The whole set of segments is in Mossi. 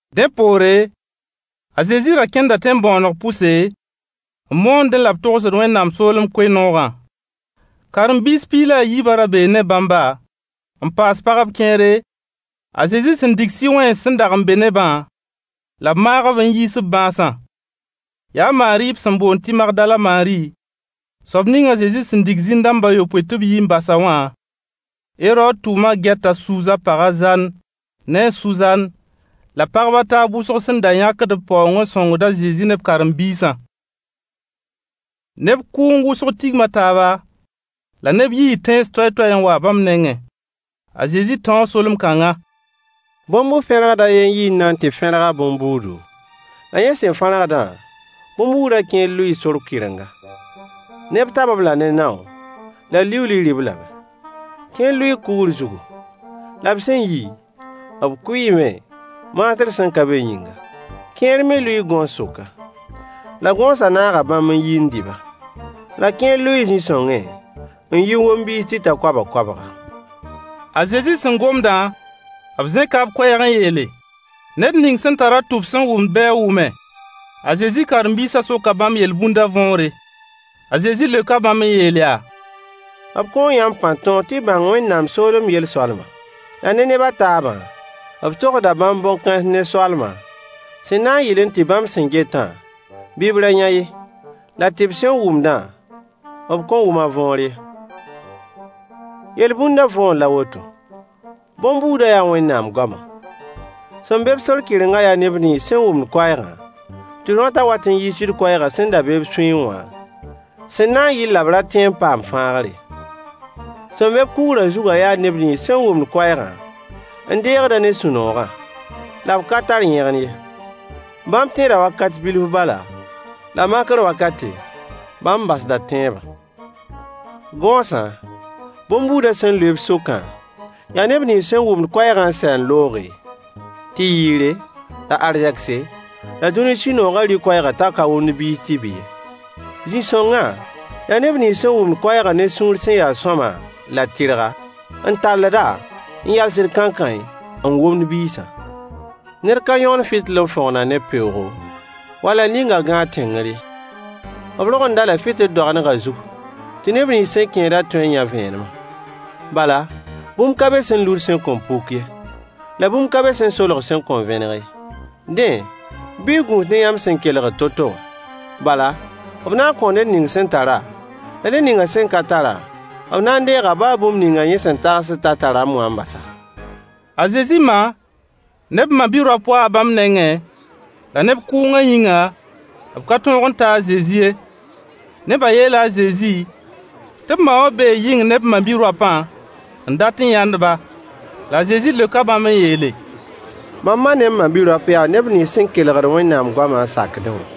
Dẽ poore, a Zezi ra kẽnda tẽn-bõoneg pʋse, n moondẽ la b togsd Wẽnnaam soolem koe-noogã. Karen-biis piig la yiibã ra bee ne bãmba, n paas pagb kẽere, a Zezi sẽn dig sɩ-wẽns sẽn n dag n be ne-bã, la b maag-b n yiis b bãasã: Yaa a Maari b sẽn boond tɩ Magdala Maari, soab ning a Zezi sẽn dig zĩn-dãmb a yopoe tɩ b yi n bas-a wã, Herood tʋʋma gɛt a Suuza pag a Zan ne a Suzan, la pagb a taab wʋsg sẽn da yãkd b paoong n sõngd a Zezi ne b karen-biisã. Neb kʋʋng wʋsg tigma taaba, la neb yii tẽns toay-toay n wa bãmb nengẽ. A Zezi tãoo solem-kãnga: Bõn-bu-fẽrgd a ye n yi n na n tɩ fẽrg a bõn-buudu, la yẽ sẽn fẽrgdã, bõn-buudã kẽer lʋɩɩ sor kɩrenga. Neb tab-b la ne nao, la liuuli rɩ-b lame. Kẽer lʋɩɩ kugr zugu. La b sẽn yi, b kʋɩɩme, maasr sẽn n ka be yĩnga. Kẽer me lʋɩɩ gõos sʋka. La gõosã naaga bãmb n yi n dɩ-ba. La kẽer lʋɩɩ zĩ-songẽ, n yi n wom biis tɩ ta koabg-koabga. A Zezi sẽn gomdã, b zẽka b koɛɛg n yeel: Ned ning sẽn n tar-a tʋb sẽn wʋmd bɩ a wʋme. A Zezi karen-biisã soka bãmb yel-bũndã võore. A Zezi leoka bãmb n yeel yaa: b kõo yãmb pãn-tõog tɩ y bãng Wẽnnaam soolem yel-soalma. La ne neb a taabã, b togsda bãmb bõn-kãens ne soalma, sẽn na n yɩl tɩ “bãmb sẽn getã, bɩ b ra yã ye, la tɩ b sẽn wʋmdã, b kõn wʋm a võor ye.” Yel-bũndã võor la a woto: bõn-buudã yaa Wẽnnaam goamã. Sẽn be-b sor kɩrengã yaa neb nins sẽn wʋm koɛɛgã, tɩ rõata wat n yiisd koɛɛgã sẽn da be b sũyẽ wã, sẽn na n yɩl la b ra tẽ n paam fãagr ye. Sẽn be-b kugrã zugã yaa neb nins sẽn wʋmd koɛɛgã n deegd-a ne sũ-noogã. La b ka tar yẽgen ye. Bãmb tẽeda wakat bilf bala, la makr wakate, bãmb basda tẽebã. Gõosã, bõn-buudã sẽn lʋɩ b sʋkã, yaa neb nins sẽn wʋmd koɛɛgã n sɛ n looge, tɩ yɩɩre, la arzegse, la dũni sũ-noogã rɩ koɛɛgã t'a ka womd biis tɩ bɩ ye. Zĩ-sõngã, yaa neb nins sẽn wʋmd koɛɛgã ne sũur sẽn ya sõama la tɩrga, n talld-a, n yalsd kãenkãe, n womd biisã. Ned ka yõgend fɩtɩl n fõgn-a ne peoogo, wall a ning-a gãag tẽngr ye. B rogend-a-la fɩtɩl doagendgã zug tɩ neb nins sẽn kẽedã tõe n yã vẽenemã. Bala, bũmb ka be sẽn lud sẽn kõn puk ye, la bũmb ka be sẽn solg sẽn kõn vẽneg ye. Dẽ, bɩ y gũus ne yãmb sẽn kelgd to-to wã. Bala, b na n kõo ned ning sẽn tara, la ned ning sẽn ka tara, b na n deega baa bũmb ning yẽ sẽn tagsd t'a tarame wã n bas-a. A Zezi ma ne b ma-bi-raop waa bãmb nengẽ, la neb kʋʋngã yĩnga, b ka tõog n ta a Zezi ye. Nebã yeela a Zezi tɩ b ma wã bee yɩng ne b ma-bi-raopã n dat n yãnd-ba. La a Zezi leoka bãmb n yeele: mam ma ne m ma-bi-raop yaa neb nins sẽn kelgd Wẽnnaam goamã n sakdẽ wã.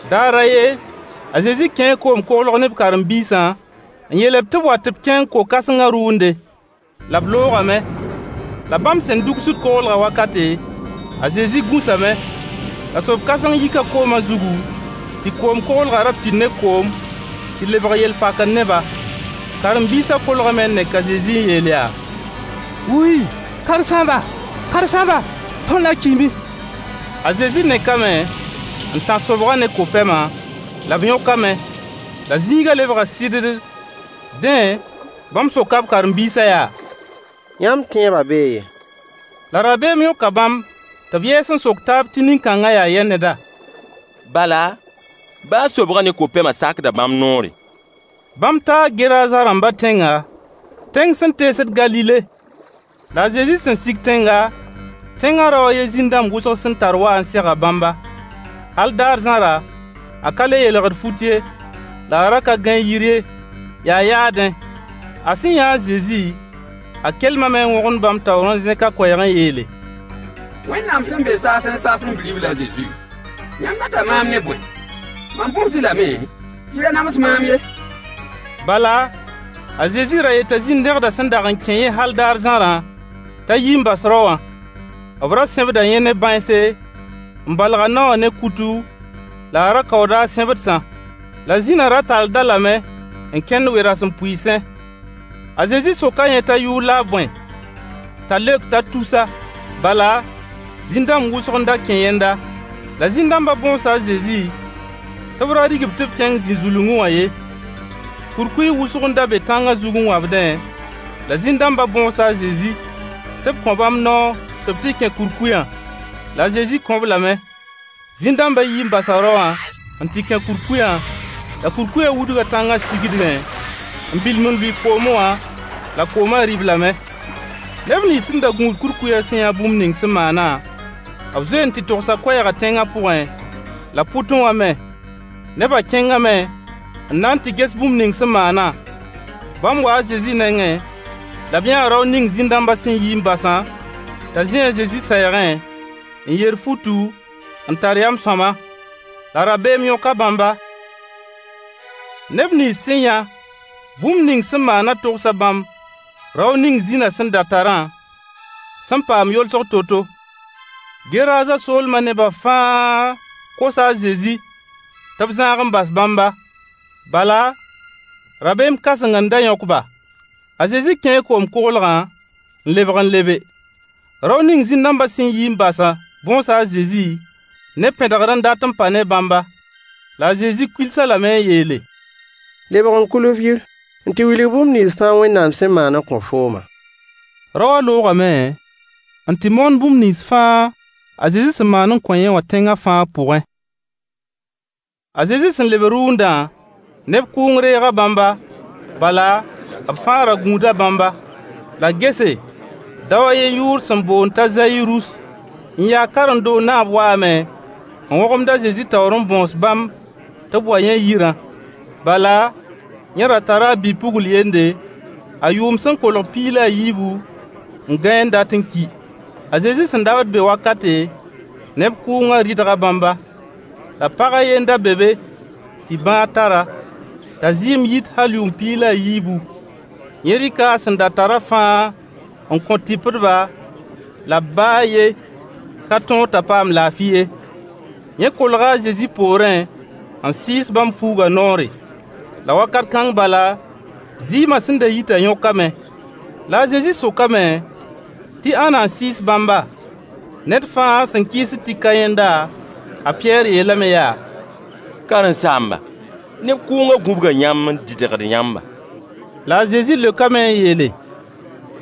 Daar a ye, a Zezi kẽe koom-koglg ne b karen-biisã, n yeel-b tɩ b wa tɩ b kẽng ko-kãsengã rʋʋnde. La b loogame. La bãmb sẽn dugsd koglgã wakate, a Zezi gũsame. La sob-kãseng yika kooma zugu, tɩ koom-koglgã ra pid ne koom, tɩ lebg yel-pakr ne-ba. Karen-biisã kolgame n nek a Zezi n yeel yaa: Karen-saamba! Karen-saamba! Tõnd na n kiime! A Zezi nekame, n tãs sobgã ne ko-pɛmã, la b yõkame, la zĩigã lebga sɩddd. Dẽ, bãmb soka b karen-biisã yaa: Yãmb tẽebã bee yɛ? La rabeem yõka bãmb tɩ b yɛɛs n sok taab tɩ nin-kãngã yaa yɛ neda? Bala, baa sobgã ne ko-pɛma sakda bãmb noore. Bãmb taa Geraza rãmbã tẽnga, tẽng sẽn teesd Galile. La a Zezi sẽn n sig tẽnga, tẽngã rao a ye zĩn-dãmb wʋsg sẽn tar waa n sega bãmba. Hal daar zãra, a ka le yeelgd fut ye, la a ra ka gãe yir ye, yaa yaadẽ. A sẽn yãa a Zezi, a kelmame n wõgemd bãmb taoor n zẽk a koɛɛg n yeele: Wẽnnaam sẽn be saasẽ saasẽ bi-ribl a Zezi, yãmb data maam ne bõe? Mam bõosd-y lame tɩ y ra nams maam ye. Bala, a Zezi ra yeta zĩn-dẽgdã sẽn dag n kẽ yẽ hal daar zãrã t'a yi n bas rao wã. B ra sẽbda yẽ ne bãense, n balg a nao wã ne kutu, la a ra kaooda a sẽbdsã. La zĩna ra talld-a lame n kẽngd we-rasempʋɩɩsẽ. A Zezi soka yẽ t'a yʋʋr la a bõe. T'a leok t'a tusa. Bala, zĩn-dãmb wʋsg n da kẽ yẽnda. La zĩn-dãmbã bõosa a Zezi tɩ b ra rig-b tɩ b kẽng zĩ-zulungẽ wã ye. Kurkuy wʋsg n da be tãnga zug n wãbdẽ, la zĩn-dãmbã bõosa a Zezi tɩ b kõ bãmb noor tɩ b tɩ kẽ kurkuyã. La a Zezi kõ-b lame. Zĩn-dãmbã yii n basa rao wã n tɩ kẽ kurkuyã, la kurkuyã wudga tãnga sigdgẽ, n bilim n lʋɩ koomẽ wã, la koomã rɩ-b lame. Neb nins sẽn da gũud kurkuyã sẽn yã bũmb ning sẽn maanã, b zoee n tɩ togsa koɛɛgã tẽnga pʋgẽ la pʋtẽ wã me. Nebã kẽngame n na n tɩ ges bũmb ning sẽn maanã. Bãmb waa a Zezi nengẽ, la b yãa rao ning zĩn-dãmbã sẽn yi n basã t'a zĩ a Zezi sɛɛgẽ, n yer futu, n tar yam sõama. La rabeem yõka bãmba. Neb nins sẽn yã bũmb ning sẽn maanã togsa bãmb rao ning zĩna sẽn da tarã sẽn paam yolsg to-to. Geraza soolmã neba fãa kosa a Zezi tɩ b zãag n bas bãmba. Bala, rabeem kãseng n da yõk-ba. A Zezi kẽe koom-koglgã n lebg n lebe. Rao ning zĩn-dãmbã sẽn yi n basã bõosa a Zezi ne pẽdgr n dat n pa ne bãmba. La a Zezi kuils-a lame n yeele: Lebg n kuil f yir n tɩ wilg bũmb nins fãa Wẽnnaam sẽn maan n kõ fooma. Rao wã loogame n tɩ moon bũmb nins fãa a Zezi sẽn maan n kõ yẽ wã tẽngã fãa pʋgẽ. A Zezi sẽn leb rʋʋndã, neb kʋʋng reega bãmba, bala, b fãa ra gũuda bãmba. La gese, dao a yen yʋʋr sẽn boond t'a Zayirus, n yaa karen-doog naab waame n wõgemd a Zezi taoor n bõos bãmb tɩ b wa yẽ yirã. Bala, yẽ ra tara a bi-pugl yende, a yʋʋm sẽn kolg piig la yiibu, n gãe n dat n ki. A Zezi sẽn dabd be wakate, neb kʋʋngã rɩdga bãmba. La pag a ye n da be be tɩ bãag tar-a, t'a zɩɩm yit hal yʋʋm piig la a yiibu. Yẽ rɩka a sẽn da tarã fãa n kõ tɩpdba, la b baa a yen ka tõog t'a paam laafɩ ye. Yẽ kolga a Zezi poorẽ, n sɩɩs bãmb fuugã noore. La wakat kãng bala, zɩɩmã sẽn da yitã yõkame. La a Zezi sokame tɩ ãnna n sɩɩs bãmba? Ned fãa sẽn kɩɩsd tɩ ka yẽnda, a Pɩyɛɛr yeelame yaa: Karen-saamba, neb kʋʋngã gũbga yãmb n dɩdgd yãmba. La a Zezi leokame n yeele: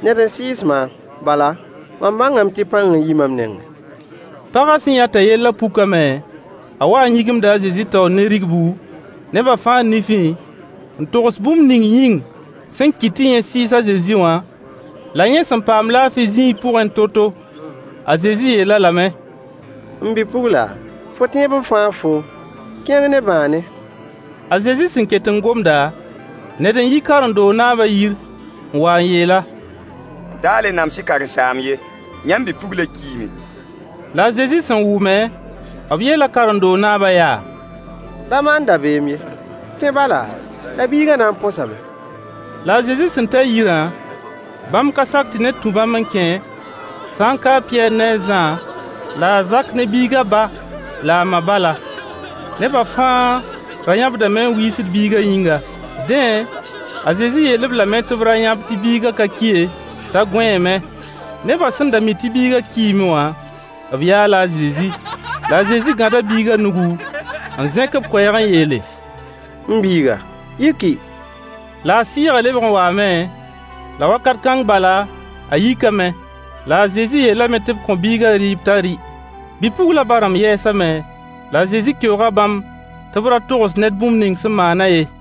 Ned n sɩɩs maam. Bala, mam bãngame tɩ pãng n yi mam nengẽ. Pagã sẽn yã t'a yellã pukame, a waa n yĩgimda a Zezi taoor ne rigbu, neba fãa nifẽ, n togs bũmb ning yĩng sẽn kɩt tɩ yẽ sɩɩs a Zezi wã, la yẽ sẽn paam laafɩ zĩig pʋgẽ to-to. A Zezi yeel-a lame: M bi-pugla, fo tẽeb n fãag foom, kẽng ne bãane. A Zezi sẽn ket n gomda, ned n yi karen-doog naabã yir n wa n yeel-a: Da le nams-y karen-saamb ye: Yãmb bi-puglã kiime. La a Zezi sẽn wʋme, b yeela karen-doog naabã yaa: Da maan dabeem ye. Tẽ bala, la biigã na n põsame. La a Zezi sẽn ta yirã, bãmb ka sak tɩ ned tũ bãmb n kẽ, sã n ka a Pɩyɛɛr ne a Zã, la a Zak ne biigã ba la a ma bala. Neba fãa ra yãbdame n wiisd biigã yĩnga. Dẽ, a Zezi yeel-b lame tɩ b ra yãb tɩ biigã ka ki ye, t'a gõeeme. Nebã sẽn da mi tɩ biiga kiime wã, b yaala a Zezi. La a Zezi gãda biigã nugu, n zẽk b koɛɛg n yeele: M biiga, yiki. La a sɩɩgã lebg n waame, la wakat kãng bala, a yikame. La a Zezi yeelame tɩ b kõ biiga rɩɩb t'a rɩ. Bi-puglã ba-rãmb yɛɛsame, la a Zezi keooga bãmb tɩ b ra togs ned bũmb ning sẽn maanã ye.